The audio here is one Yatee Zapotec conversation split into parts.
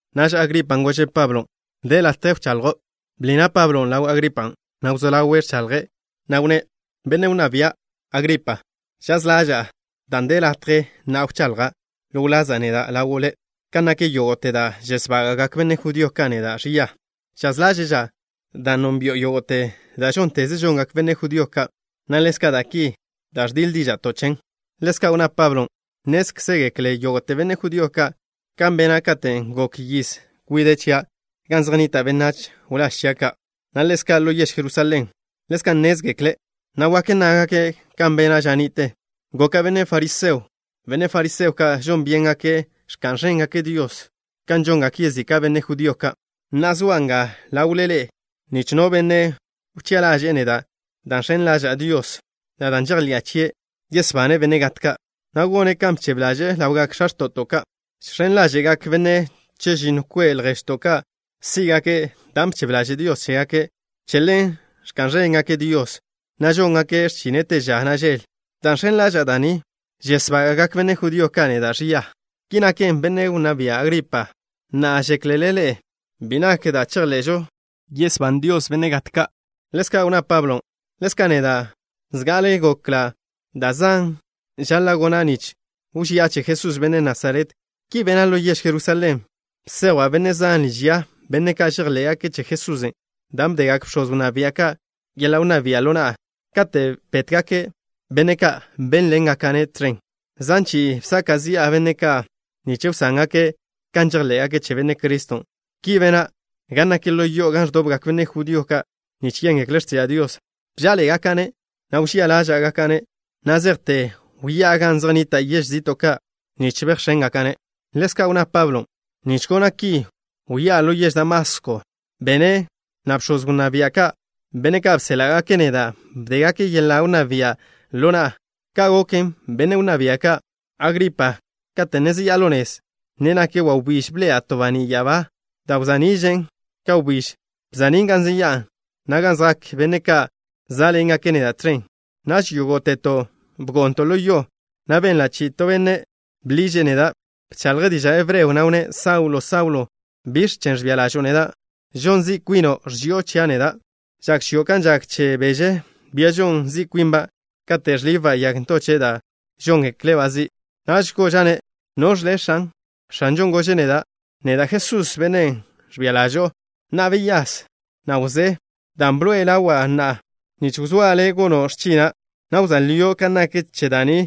Naž Agripan' gože' Pablo: —De latje wchaḻjo'. Bḻi na' Pablon' ḻaw Agripan', na' wzó ḻawe' ẕchaḻje', na' wnné': —Benne' wnná bia', Agripa. Žaz ḻaža'a dan' de latje na'a wchaḻja' ḻo wlaza' neda' ḻawo' le' kan nak yógo'te da' žesbága'gak benne' judío ka' neda' ẕia. Žaz ḻáže'ža' dan' nónbi'o yógo'te da' žónteze žongak benne' judío ka', na' ḻezka' da' ki da' ẕdiḻ díža'to' chen. Ḻezka' wnná Pablon': —Nnézkzegekle yógo'te benne' judío ka' kan bena' katen' gok yiz kwide' chia' gan zej nnita' benách wláž chia' ka', na' ḻezka' ḻo yež Jerusalén. Ḻezka' nnézkzegekle', na' wak nnágake' kan bena' ža ni'te. Goka' benne' fariseo. Benne' fariseo ka' žon byéngake' ẕka'n ẕéngakže' Dios ka žongak yezika' benne' judío ka'. Na'a, zoa' nga ḻawle ḻe'e nich no benne' wchi'a ḻaže'e neda' dan' žx̱en ḻaža'a Dios, na' dan' žejḻi'a chie' yesbane' benne' gat ka', na' gone' kan bchebe ḻaže'e ḻawgak x̱a x̱to'to' ka'. Žx̱en ḻáže'gak benne' chežinno kwe' lježto' ka' sí'gake' dan' bchebe ḻaže' Dios chégake'. Che ḻen ẕka'n ẕéngake' Dios, na' žóngake' x̱chine' te ža, na' žel. Dan' žx̱en ḻaža'a da' ni, žesbága'gak benne' judío ka' neda' ẕia. Ki naken, benne' wnná bia', Agripa. Na'a, ¿žéklele ḻe'e bi nak da' chejḻe'žo, yesbane' Dios benne' gat ka'? Ḻezka' wnná Pablo: —Ḻezka' neda', zga'ale gokla' da' zan žaḻa' gona' nich wži'a che Jesús, benne' Nasaret. Ki bena' ḻo yež Jerusalén. Bsejwa' benne' zan liž ya, benne' ka' žejḻé'gake' che Jesusen', dan' bdegak bx̱oz wnná bia' ka' yeḻa' wnná bia' ḻo na'a. Katen' bétgake' benne' ka', bénḻengaka'-ne' tẕen. Zan chi'i bsaka' zi'a benne' ka', nich wsángake' kan žejḻé'gake' che Benne' Criston'. Ki bena' gan nak ḻo yo'o gan ẕdobgak benne' judío ka' nich yéngekle' x̱tiža' Dios. Bžá'aḻe'egaka'-ne', na' wžía ḻáže'gaka'-ne' na' zejte wyá'a gan zej nnita' yež zi'to' ka' nich bejx̱éngaka'-ne'. Ḻezka' wnná Pablo: —Nich gona' ki wyá'a ḻo yež Damasko, na' bx̱oz wnná bia' ka', benne' ka' bséḻa'gake' neda', bdégake' yeḻa' wnná bia' ḻo na'a. Ka' goken, benne' wnná bia', Agripa. Kate' ne zeyá'a ḻo nez, ne nak wawbíž, bḻe'ela' to baní' ya'abá da' wza'ni'žen ka wbíž. Wza'nín' gan zeyá'a, na' gan zjak benne' ka' zá'ḻengake' neda' tẕen. Naž yógo'teto' bgo'nto' ḻo yo, na' benla' chi'i to benne' bḻiže' neda'. Bchaḻje' diža' hebreo, na' wnné': “Saulo, Saulo, ¿biẕ chen' ẕbia ḻažo'o neda'? Žon zi' kwino', ẕži'o chia' neda'. Žak chio' kan žak che beže, bia žon zi' kwinba', kate' ẕlibba' yag ntoche' da' žóngekle'-ba' zi'.” Naž goža'-ne': “¿Noẕ le', X̱an?” X̱anžon' gože' neda': “Neda' Jesús, Bennen' ẕbia ḻažo'o. Na'a, beyás, na' wzé, dan' bḻoe'e ḻawa' na'a, nich wzóa' le' gono' x̱china', na' wzóa lio' kan nak che da' ni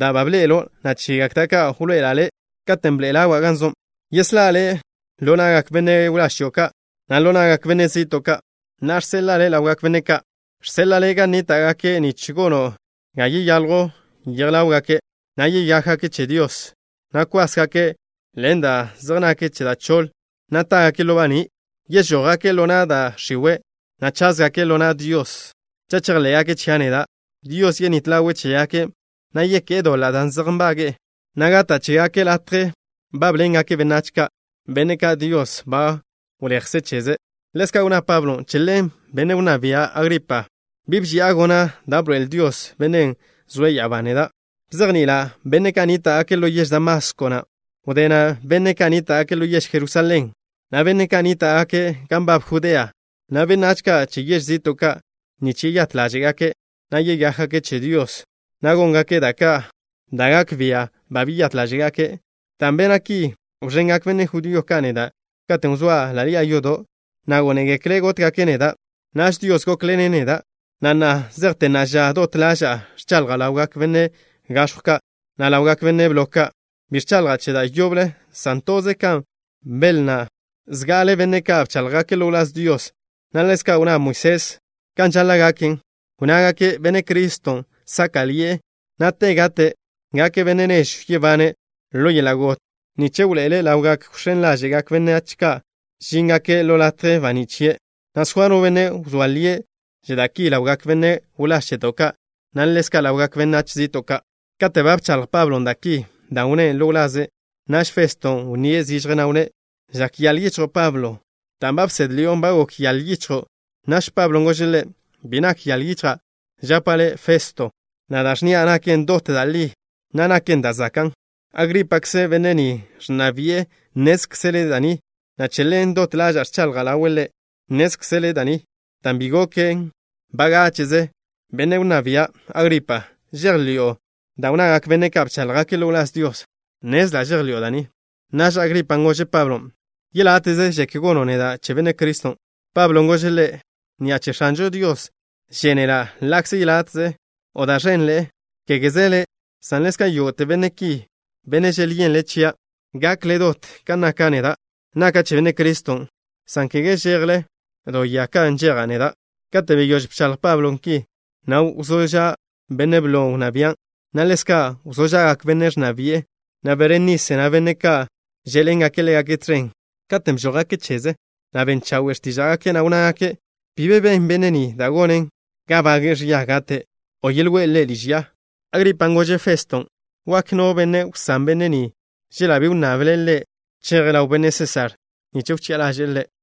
da' ba bḻe'elo', na' chegak da' ka' wḻoe'ela' le', katen' wḻoé'e ḻawa' gan zo'. Yeslá' le' ḻo na'gak benne' wláž chio' ka', na' ḻo na'gak benne' zi'to' ka'. Na'a žseḻa'a le' ḻawgak benne' ka'. Žseḻa'a le' gan nníta'gake' nich gono' ga yeyaljw yej ḻáwgake', na' yeyákgake' che Dios, na' kwásgake' ḻen da' zej nak che da' choḻ, na' tágake' ḻo baní'. Yežójgake' ḻo na' da' x̱iwe', na' cházgake' ḻo na' Dios. Cha' chejḻé'gake' chia' neda', Dios yenít ḻawe' chégake', na' yeké'e doḻa' da' zej nbage'e, na' gata' chégake' latje bábḻengake' benách ka', benne' ka' Dios ba wleje' cheze'.” Ḻezka' wnná Pablon': —Che ḻen, benne' wnná bia', Agripa, bi bži'a gona' da' bḻoe'el Dios, Bennen' zoe' ya'abá, neda'. Bzejni'ila' benne' ka' nníta'gake' ḻo yež Damasko, na' wdé na' benne' ka' nníta'gake' ḻo yež Jerusalén, na' benne' ka' nníta'gake' gan nbab Judea, na' benách ka' che yež zi'to' ka', nich yeyát ḻáže'gake', na' yeyákgake' che Dios, na' góngake' da' gak bia' ba beyát ḻáže'gake'. Dan' bena' ki, wẕengak benne' judío ka' neda' katen' wzóa' ḻa' ḻi'a yodo', na' gónegekle' gótgake' neda'. Naž Dios gókḻene' neda', na' na' zejte na'a ža, dot ḻaža'a ẕchaḻja' ḻawgak benne' gax̱jw ka', na' ḻawgak benne' blo ka'. Bi ẕchaḻja' che da' yoble, san toze kan belnná zga'ale benne' ka' bcháḻjgake' ḻo wláz Dios, na' ḻezka' kan wnná Moisés kan žaḻa' gaken. Wnnágake': “Benne' Criston' sáka'ḻi'e, na' te gate' gake' Benne' nežw yebane' ḻo yeḻa' got, nich wḻoe'ele' ḻaw gak wx̱én ḻáže'gak benách ka' žíngake' ḻo latje baní' chie', na' soa no benne' wzóa lie' che da' ki ḻawgak benne' wláž cheto' ka', na' ḻezka' ḻawgak benách zi'to' ka'.” Kate' ba bchaḻj Pablo da' ki, dan' wnné' ḻo wlaze', naž Festo wnníe' zižje, na' wnné': —Žak yaḻ yichjo', Pablo. Dan' bsédḻi'o, ba gok yaḻ yichjo'. Naž Pablon' gože' ḻe': —Bi nak yaḻ yichja', žapa' le', Festo, na' da' ẕnnia' naken dot da' li, na' naken da' zakan'. Agrípakze', benne' ni ẕnna bi'e, nnézkzele' da' ni, na' che ḻen, dot ḻaža'a ẕchaḻja' ḻawe' ḻe'. Nnézkzele' da' ni, dan' bi goken bagáche'ze. Benne' wnná bia', Agripa. ¿Žejḻi'o da' wnnagak benne' ka' bcháḻjgake' ḻo wláz Dios? Nnezla' žejḻi'o da' ni. Naž Agripan' gože' Pablon': —Yeláte'ze žek gono' neda' che Benne' Criston'. Pablon' gože' ḻe': —Ni'a che X̱anžo Dios žénela', ḻa'kze yeláte'ze o da' ẕenḻe'e, kégeze le', san ḻezka' yógo'te benne' ki, benne' želyenle' chia', gakle dot kan naka' neda', naka' che Benne' Criston', san kege chejle do ya kan nžeja' neda'. Kate' beyóž bchaḻj Pablon' ki, na' wzó ža' benne' blo wnná bian', na' ḻezka' wzó ža'gak bennen' ẕnna bi'e, na' Berenise, na' benne' ka' žé'ḻengake' ḻégake' tẕen. Katen' bžójgake' cheze, na' ben chawe' x̱tíža'gake', na' wnnágake': —Bi be ben benne' ni da' gonen ga bage'e ẕia gate', o yejwe' ḻe' liž ya. Agripan' gože' Feston': —Wak no benne' wsán benne' ni chela' bi wnnable' cheje' ḻaw benne' Sésar nich wchi'a ḻaže'e ḻe'.